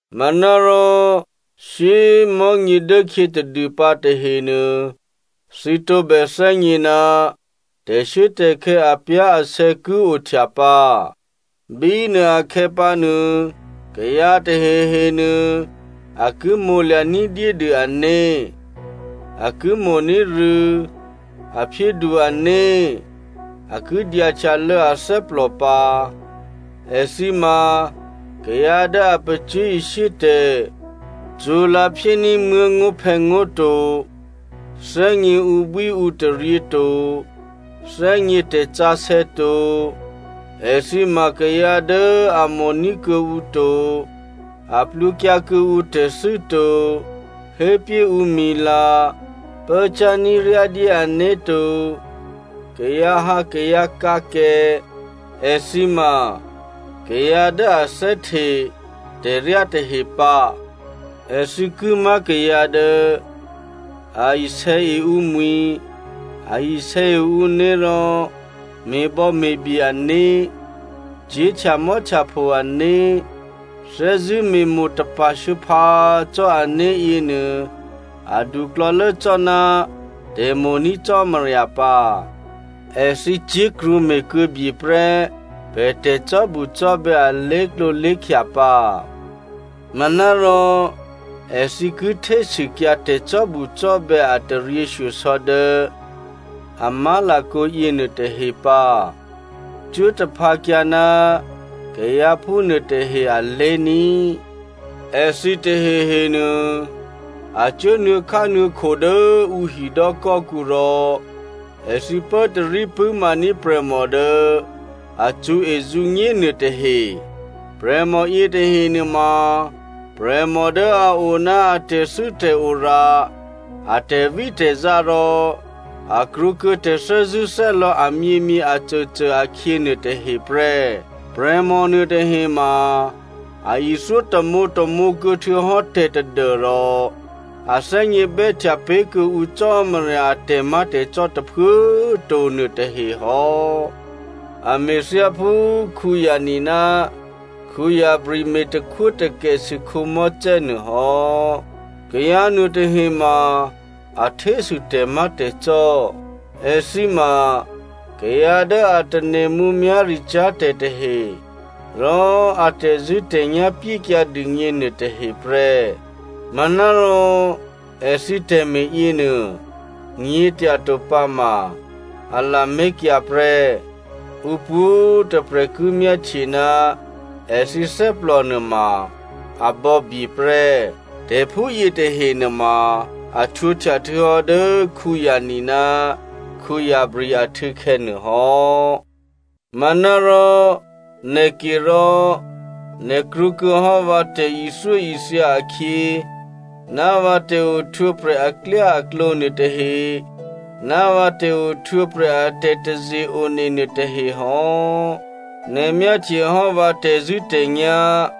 Manárò shyé꤮ mò̤́nyě dốkhyě tadûpǎ tahenuô thǐ tǒbè thè́gně ná tè̤shuốtè̤khè̌ apyá̤asè̌ ki ohtya pǎ. Bínuô akhè̌pǎnuô, kayǎ tahehe nuô, a ki mo̤lya̤ ní̤dyédû ané̤, a ki mo̤ní̤ rû̌, a phyédu ané̤, a ki dyahtyalô̌ athè́plò pǎ. Èthǐ ma kayǎ dố a pacyé̤ishyé tè̤, cṳ̌lǎ̤phyéní̤ muố̤ngó̤phè̌ngó̤ to, thè́gně ǔbwíǔtaryě to, thè́gně tè̤sǎsè̌ to. Èthǐ ma kayǎ dố a mo̤ní̤ kuô̌ǔ to, a plwǒkyǎ kuô̌ǔ tè̤thû́ to, hépyé ǔmwi̤la, pốcyá̤ ní̤ryádyé ané̤to, kayǎhǎkayǎkǎkè, èthǐ ma kayǎ dố a thè́hte tè̤ryá tahe pǎ. Èthǐ ki má̤ kayǎ dố a isè̌e ǔmwi̤, a isè̌e ǔné̤ rò me̤bò̌me̤bye ané̤, cyé̤ htyamò́htyapho ané̤, thè́zṳ̂́ me̤mo̤ tapa̤ shuô̌phǎ cò́ ané̤ yěnuô aduklò̌lố cò́ná tè̤mo̤ní̤ Cò́marya pǎ. Èthǐ cyé̤ krwǒme̤kuô̌bye prè́ pè̤ tè̤cò́bucò́bè̌ alé̤klǒ lé̤khya pǎ. Manárò èthǐ ki htésûkyǎ tè̤cò́bucò́bè̌ a taryěshyosò̌ dố a má̤lakǒ yěnuôtahe pǎ. Cuố taphǎkyǎ ná kayǎ phúnuôtahe alé̤ní꤮. Èthǐ tahehenuô, a cuố nuô̌khánuô̌kho dố ǔ hidò́kò́kǔ rò èthǐ pốtarí pṳ̂́maní̤ prè̤mò dố a cṳ̌ezǔnyé nuôtahe. Prè̤mò yětahe nuôma prè̤mò dố a o ná a tè̤thû́tè̤ora a tè̤vítè̤zá rò a krwǒkuô̌ tè̤thè́zṳ̂́thè́lò̌ amyěmyě acôcô akhyě nuôtahe prè́. Prè̤mò nuôtahe ma a ithyó tamǒtamǒ kuô̌ htuô̌hò́ tè̤ tadû́rò a thè́gně bè́htya pé̤ kuô̌ǔ Cò́marya a tè̤má̤tè̤cò́ tôphuố꤮ to nuôtahe hò́. A me̤ thyáphú Janne ná Jambres me̤ takhwótakèsû Mosè nuô hò́. Kayǎ nuôtahema a htésû tè̤má̤tè̤cò́. Èthǐ ma kayǎ dố a tane̤ mǔmyá̤ricyá̤ tè̤ tahe, rò a tè̤zṳ̂́tè̤nyá̤ pyékyǎ dûgně nuôtahe prè́. Manárò èthǐ tè̤me̤ yěnuô nyě̤tyato pǎma a lamé̤kyǎ prè́. Ǔ pwǒ̤꤮ tôprè̤ ki myáhtye ná èthǐ thè́plò nuôma a bò̌bye prè́. Tè̤phúyě tahe nuôma a htwǒhtya htuô̌hò́ dố Janne ná Jambres ahtû̌khè̌ nuôhò́. Manárò nè̤ke rò, nè̤ krwǒkuô̌hò́ vǎ tè̤ithyóithya akhyě, ná vǎ tè̤ohtwǒprè̤ aklyáaklǒ nuôtahe, ná vǎ tè̤ohtwǒprè̤ a tè̤taze-one nuôtahe hò́. Nè̤ myáhtyehò́ vǎ tè̤zṳ̂́tè̤nyá̤,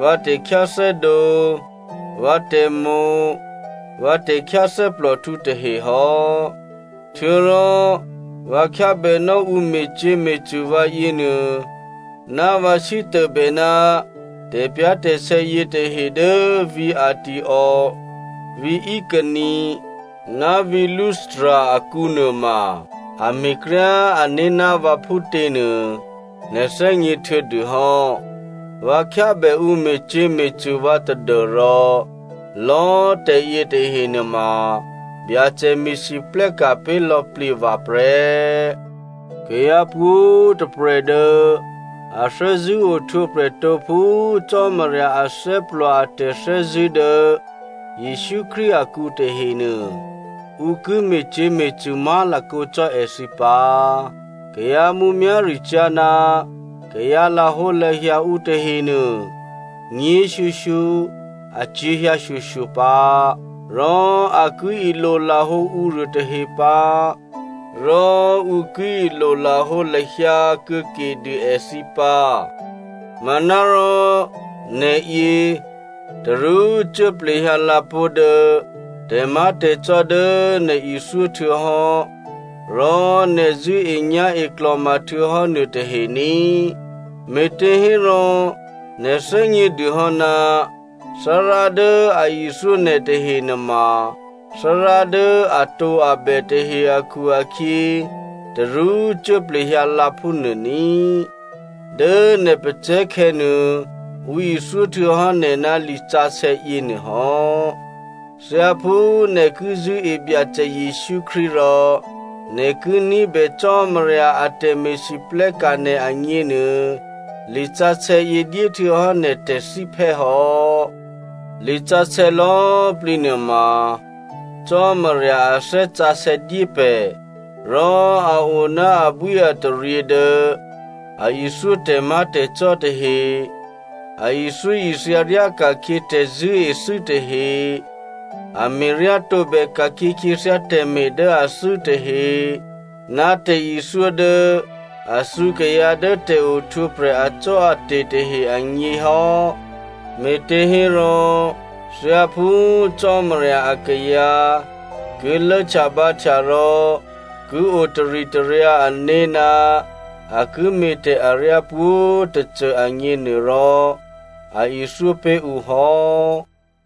vǎ tè̤khyáthè́dǒ, vǎ tè̤mo̤, vǎ tè̤khyáthè́plòhtǔ tahehò́, htuô̌rò vǎ khyábènò́ ǔ me̤cyě̤me̤cṳ̂ vǎ yěnuô, ná vǎ sítôbè ná tè̤pyá̤tè̤sè̌ yětahe dố vǐ̤ Antioko, vǐ̤ Iconio ná vǐ̤ Lystra akǔ nuôma, a me̤kryá ané̤ ná vǎ phútěnuô nè̤ thè́gně htuô̌dûhò́. Vǎ khyábè ǔ me̤cyě̤me̤cṳ̂ vǎ tadû́rò lò̌꤮ tè̤ yětahe nuôma, Byacè me̤lwóhteka̤ pé̤ lò̌plǐ vǎ prè́. Kayǎ pwǒ̤꤮ tôprè̤ dố a thè́zṳ̂́ ohtwǒprè̤ tǒ phú Cò́marya athè́plò a tè̤thè́zṳ̂́ dố Jesǔ Krístu akǔ tahenuô, ǔ ki me̤cyě̤me̤cṳ̂ má̤lakǒ cò́ èthǐ pǎ. Kayǎ mǔmyá̤ricyá̤ ná kayǎ lahǒlahya ǔ tahenuô, nyě̤shyoshyo acyě̤hyǎ shyoshyo pǎ. Rò a ki ilolahǒ ǔruô tahe pǎ, rò ǔ ki ilolahǒ lahyǎ kuô̌kedû èthǐ pǎ. Manárò nè̤yě, tarú cuốplehyǎ lǎ pó̤ dố tè̤má̤tè̤cò́ dố nè̤ ithyó htuô̌hò́, rò nè̤ zṳ̂́enyá̤e klò̤ma htuô̌hò́ nuôtahe ní꤮, me̤těhérò nè̤ thè́gnědûhò́ ná Thárá dố a ithyó nè̤ tahe nuôma Thárá dố atǒabè tahe akhu-akhyě, tarú cuốplehyǎ lǎ phúnuô ní꤮. Dố nè̤ pacè̤̌khè̌ nuô, ǔ ithyó htuô̌hò́ nè̤ ná lisǎsè̌ yěnuô hò́. Thyáphú nè̤ ki zṳ̂́e Byacè Jesǔ Krístu rò nè̤ ki ní̤bè Cò́marya a tè̤me̤lwóhteka̤ nè̤ agněnuô, lisǎsè̌yě dyéhtuô̌hò́ nè̤ tè̤thíphè́ hò́. Lisǎsè̌ lò̌꤮ plǐ nuôma Cò́marya a Thè́ Sǎsè̌ dyé pè̤, rò a o ná abwíataryě dố a ithyó tè̤má̤tè̤cò́ tahe, a ithyóithya ryáka̤khyě tè̤zṳ̂́ethû́ tahe, a me̤ryá tǒbè ka̤khyě khyěthyá tè̤me̤ dố athû́ tahe, ná tè̤ithyó dố a thǔ kayǎ dố tè̤ohtwǒprè̤ acò́ate̤ tahe agně hò́, me̤těhérò thyáphú Cò́marya akayǎ ki lốhtyabǎhtya rò ki o taritaryǎ ané̤ ná a ki me̤tè̤ aryá pwǒ̤꤮ tôcô agněnuôrò, a ithyó pé̤ ǔ hò́.